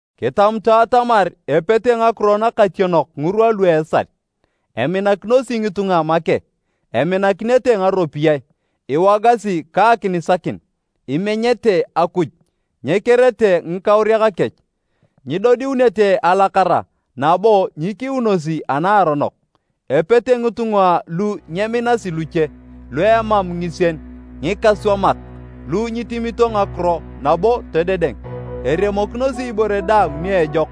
Kitamutu atamar epete ngakiro nakationok ngirwa lu a esal. Eminakinosi ngitunga make, eminakinete ngaropiyae, iwogasi ka akinisakin, imenyete Akuj, nyekerete ngikauriak kech, nyidodiunete alakara nabo nyikiunosi a naaronok. Epete ngitunga lu nyeminasi luche, lu emam ngisien, ngikaswamak, lu nyitemito ngakiro nabo todedeng, eremokinosi ibore daang ni ejok.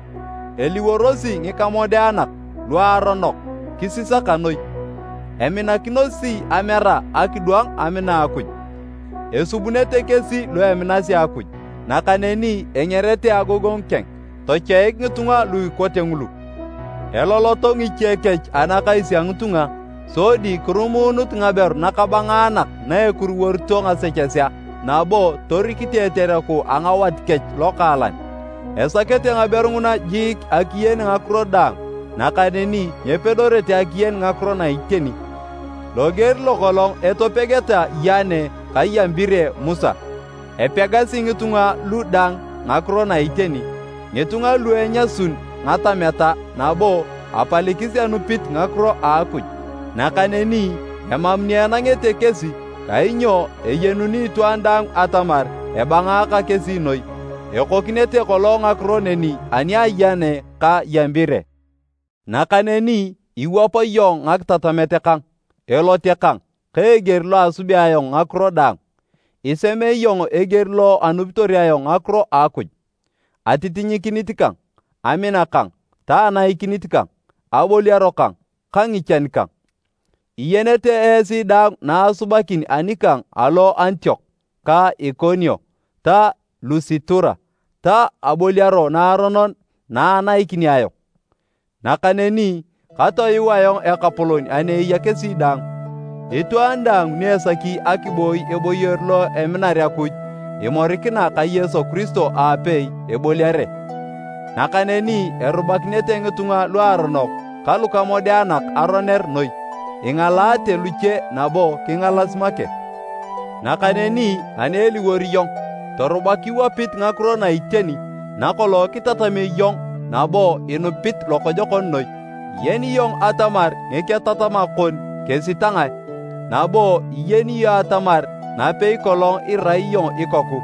Eliworosi ngikamodeanak, luaronok, kisisaka noi. Eminakinosi amera akidwang amina Akuj. Esubunete kesi lu eminasi Akuj, nakaneni engerete agogongu keng. Tochoik ngitunga lu ikote ngulu. Eloloto ngiche kech anakais a ngitunga sodi kirumuunut ngaberu nakabangaanak na ekuruworito ngasechesea nabo torikite etereku a ngawat kech lokaalan, esakete ngaberu nguna jiik akiyen ngakiro daang nakaneni nyepedorete akiyen ngakiro na iteni. Loger lokolong etopegeta Yane ka Yambire Musa, epegasi ngitunga lu dang ngakiro na iteni, ngitunga lu enyasun ngatameta nabo apalikis anupit ngakiro a Akuj. Nakaneni emam ni enangete kesi kainyo eyenuni itwaan daang atamar ebangaaka kesi noi. Ekokinete kolong ngakiro neni ani a Yane ka Yambire. Nakaneni iwap iyong ngakitatamet kang, elote kang ka eger lo asubea ayong ngakiro daang. Iseme iyong eger lo anupitor ayong ngakiro a Akuj, atitinyikinit kang, amina kang ta anaikinit kang, aboliaro kang ka ngichan kang. Iyenete esi daang na asubakin anikang alo Antiok ka Ikonio ta Lusitura ta aboliaro naaronon na anaikini ayong! Nakaneni katoyuu ayong Ekapolon ani eya kesi daang. Itwaan daang ni esaki akiboi eboyor lo eminar Akuj imorikina ka Yesu Kiristo aapei, eboliare. Nakaneni erubakinete ngitunga luaronok ka lukamodeanak aroner noi, ingalaate luche nabo kingalas make. Nakaneni ani eliwor iyong torubak iwapit ngakiro na iteni nakolong kitatamio iyong nabo inupit lokojokon noi. Iyeni iyong atamar ngiketatamak kon kesi ta ngae, nabo iyeni iyong atamar napei kolong irai iyong ikoku,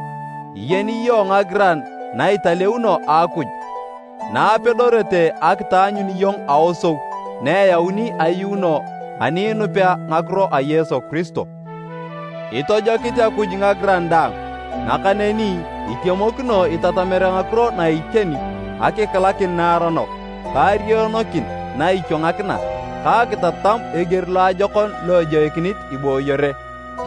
iyeni iyong ngagiran na italeuno a Akuj na apedorete akitaanyun iyong aosou na eyauni ayuuno ani inupea ngakiro a Yesu Kiristo. Itojokit Akuj ngagiran daang nakaneni itemokino itatamere ngakiro na iteni, akikilakin naaronok, ka arionokin na ichwangakina ta akitatam eger loajokon lo ejoikinit ibooyere.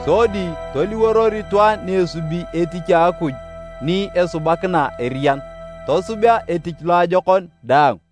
Sodi toliworor itwaan ni esubi etich a Akuj ni esubakina eriyan, tosubea etich loajokon daang.